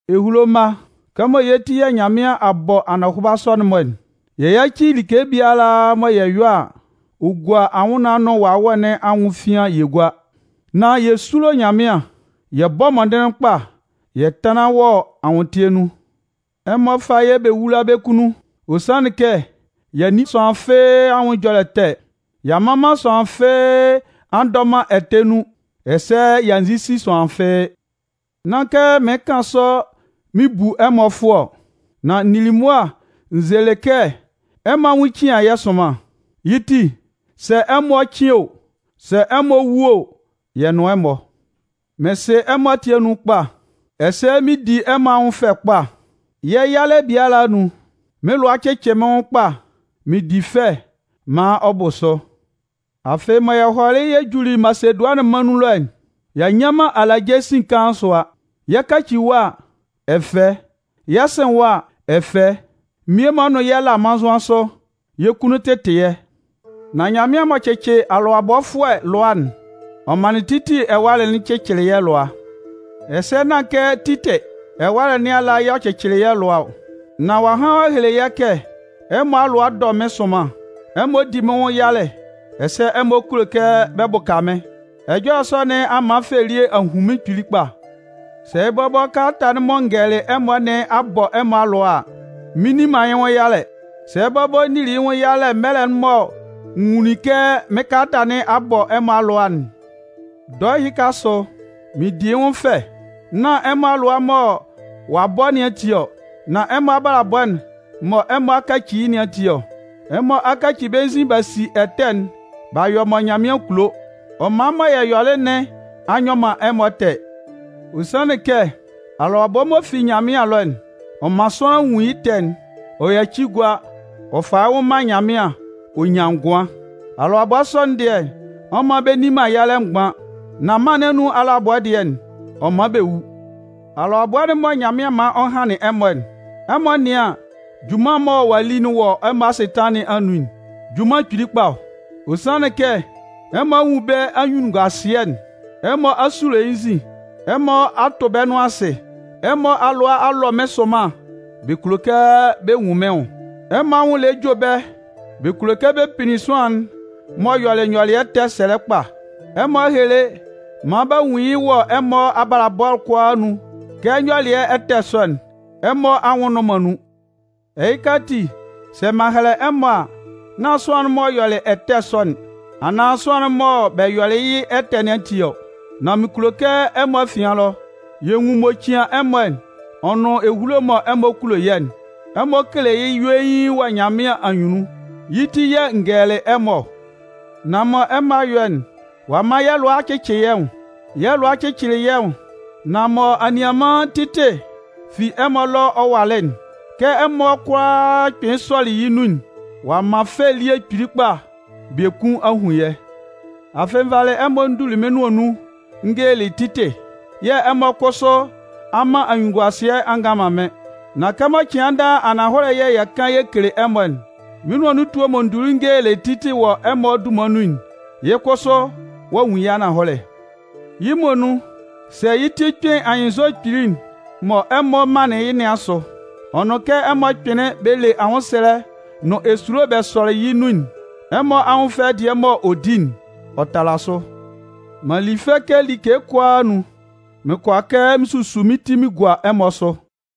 Ehulo mma, kɛmɔ yɛ́ ti yɛ̂ Nyanmɩan a bɔ anɔhʋba sɔ'n-mɔ'n, yɛ yáci like biala mɔ yɛ yɔ a, ɔ gua anwʋnnaan'n nʋn wawɛ nɩn anwʋn efian'n yɛ gúa. Nán yɛ súlo Nyanmɩan yɛ bɔ́ mɔndɩnlɩn kpa yɛ tánlan wɔ anwʋntɩɛ nun. Ɛmɔ fá yɛ́ bɛ wúla bɛ́ kunnun! Ɔ sanlɩn kɛ y'a nni sʋanlan fɩ́ɩ́ anwʋn ɛjɔlɛ ɛtɛ, y'a mman man sʋanlan fɩ́ɩ́ a ndɔ man ɛtɛ nun, ɛsɛ y'a nzisi sʋanlan fɩ́ɩ́. Nán kɛ mɩɩn kan sɔ mɩn bu ɛmɔ fʋɔ ɔ. Nan n nili mʋa n zelɩ kɛ ɛmɔ anwʋn cian yɛ́ sʋnman. Yɩ́ ti, sɛ ɛmɔ 'cɩn o, sɛ ɛmɔ 'wu o, yɛ nʋn ɛmɔ. Mɩn sɩ ɛmɔ ati anun kpa, ɛsɛ mɩn di ɛmɔ anwʋn fɛ kpa. Yɛ́ yalɛ biala anun, mɩ́n lʋa cɩcɩ mɩ́n nwʋn kpa mɩn di fɛ maan ɔ bʋ sʋ. Afɩ mɔ yɛ hɔlɩ juli Masedʋanɩn mân nun ɛlɔ'n, y'a nnyan man alaje sin kaan sʋa. Yɛ 'kaci ɛwa, ɛfɛ, yɛ 'sɩn ɛwa, ɛfɛ. Mmie-mɔ nʋn yɛ la mannzʋan sʋ, yɛ́ kunnun tɩtɩ yɛ́. Nan Nyanmɩan m'ɔ cɩcɩ alʋabɔfʋɛ lʋa'n, ɔ manlɩn Titɩ ɛwalɛ'n cɩcɩlɩ yɛ́ lʋa. Ɛsɛ nán kɛ Titɩ ɛwalɛ nɩn ala y'ɔ cɩcɩlɩ yɛ́ lʋa ɔ, nan ɔ'a han ɔ'a hele yɛ́ kɛ ɛmɔ alʋa dɔ mɩ́n sʋnman, ɛmɔ di mɩ́n nwʋn yalɛ, ɛsɛ ɛmɔ kulo kɛ bɛ bʋka mɩ́n. Ɛjɔlɛ sɔ nɩn a man fɛ elie a hun mɩ́n kpili kpa. Sɛ bɔbɔ kalata'n mɔ n gɛlɛlɩ ɛmɔ nɩn a bɔ ɛmɔ alʋa a, mɩn nni man yɩ́ nwʋn yalɛ. Sɛ bɔbɔ n nili yɩ́ nwʋn yalɛ mɛlɛ mɔ n nwunlin kɛ mɩ́n kalata nɩn a bɔ ɛmɔ alʋa'n, dɔɛ ɛhɩka asʋ, mɩn di yɩ́ nwʋn fɛ, nán ɛmɔ alʋa mɔ ɔ'a bɔ nɩn ati ɔ, nan ɛmɔ abalabɔ'n mɔ ɛmɔ kaci yɩ́ nɩn ati ɔ. Ɛmɔ alʋabɔ sɔ nɩn anun, ɛmɔ a kaci bɛ́ nzin b'a si ɛtɛ'n b'a yɔ mɔ Nyanmɩan kulo. Ɔ man mɔ yɛ yɔlɩ nɩn a nyɔ man ɛmɔ ɛtɛ. Ɔ sanlɩn kɛ alʋabɔ'n m'ɔ fi Nyanmɩan ɛlɔ'n, ɔ man sʋanlan nwun yɩ́ ɛtɛ'n ɔ yaci gua ɔ fa yɩ́ nwʋn man Nyanmɩan ɔ nyan ngʋan. Alʋabɔ sɔ'n dɩɛ, ɔ man bɛ nni man yalɛ mgban. Nan mân nɩn anun alʋabɔ dɩɛ'n, ɔ man bɛ wu. Alʋabɔ'n mɔ Nyanmɩan man ɔ hanlɩn ɛmɔ'n, ɛmɔ nɩ́an junman mɔ ɔ'a li wɔ ɛmɔ asɩtanlan nɩn anun'n! Junman kpili kpa ɔ! Ɔ sanlɩn kɛ ɛmɔ a nwun bɛ́ anyunnunguasɩɛ'n, ɛmɔ a sulo yɩ́ nzin, ɛmɔ a tʋ bɛ́ nʋan asɩ. Ɛmɔ alʋa a lɔ mɩ́n sʋnman bɛ kulo kɛ bɛ nwun mɩ́n nwʋn. Ɛmɔ anwʋn lɛ jue bɛ́ bɛ kulo kɛ bɛ pinnin sʋanlan'n m'ɔ yɔlɩ nyɔlɩɛ ɛtɛ'n sɛlɛ kpa. Ɛmɔ a hele maan b'a nwun yɩ́ wɔ ɛmɔ abalabɔ'n kʋalaa anun kɛ nyɔlɩɛ ɛtɛ sɔ'n, ɛmɔ anwʋn nnʋn man nun. Ɛhɩka, sɛ m'an hɛlɛ ɛmɔ a, nán sʋanlan'n m'ɔ yɔlɩ ɛtɛ sɔ'n, anaan sʋanlan'n mɔ bɛ yɔlɩ yɩ́ ɛtɛ nɩn ati ɔ. Nan mɩn kulo kɛ ɛmɔ afian ɛlɔ, yɛ́ nwʋn'n m'ɔ cian ɛmɔ ɔ nʋn ehulo mɔ ɛmɔ kulo yɛ́'n, ɛmɔ kele yɩ́ yuein wɔ Nyanmɩan anyunnun. Yɩ́ ti yɛ̂ n gɛlɛlɩ ɛmɔ ɔ. Nan mɔ ɛmɔ a yɔ'n, ɔ'a man yɛ́ lʋa a cɩcɩ yɛ́ nwʋn. Yɛ́ lʋa cɩcɩlɩ yɛ́ nwʋn, nan mɔ anianman Titɩ fi ɛmɔ ɛlɔ ɔ walɩ'n, kɛ ɛmɔ kʋalaa kpɩnlɩn sɔlɩ yɩ́ nun'n, ɔ'a man fɛ elie kpili kpa biekun a hun yɛ́. Afɩ, n valɩ ɛmɔ n duli mɩ́n nʋan nun n gelelɩ Titɩ, yɛ̂ ɛmɔ kʋsʋ a man anyunnunguasɩɛ a ngan man mɩ́n. Nan kɛmɔ cɩan daa ananhɔlɛ yɛ̂ yɛ kan yɛ kele ɛmɔ'n, mɩ́n nʋan nun etue mɔ n duli n gelelɩ Titɩ wɔ ɛmɔ dunman nun'n, yɩ́ kʋsʋ ɔ'a nwun yɩ́ ananhɔlɛ. Yɩ́ muonun, sɛ yɩ́ ti kpɩn anyɩnnzɔ kpili'n mɔ ɛmɔ manlɩn yɩ́ nɩn asʋ, ɔ nʋn kɛ ɛmɔ kpɩnlɩn bɛ le anwʋnwʋsʋɛ nʋn esulo bɛ sɔlɩ yɩ́ nun'n, ɛmɔ anwʋn fɛ dɩɛ mɔ ɔ di'n, ɔ tala sʋ. M'an li fɛ kɛ like kʋalaa anun, mɩn kʋala kɛ mɩn susu mɩ́n ti mɩn gua ɛmɔ asʋ.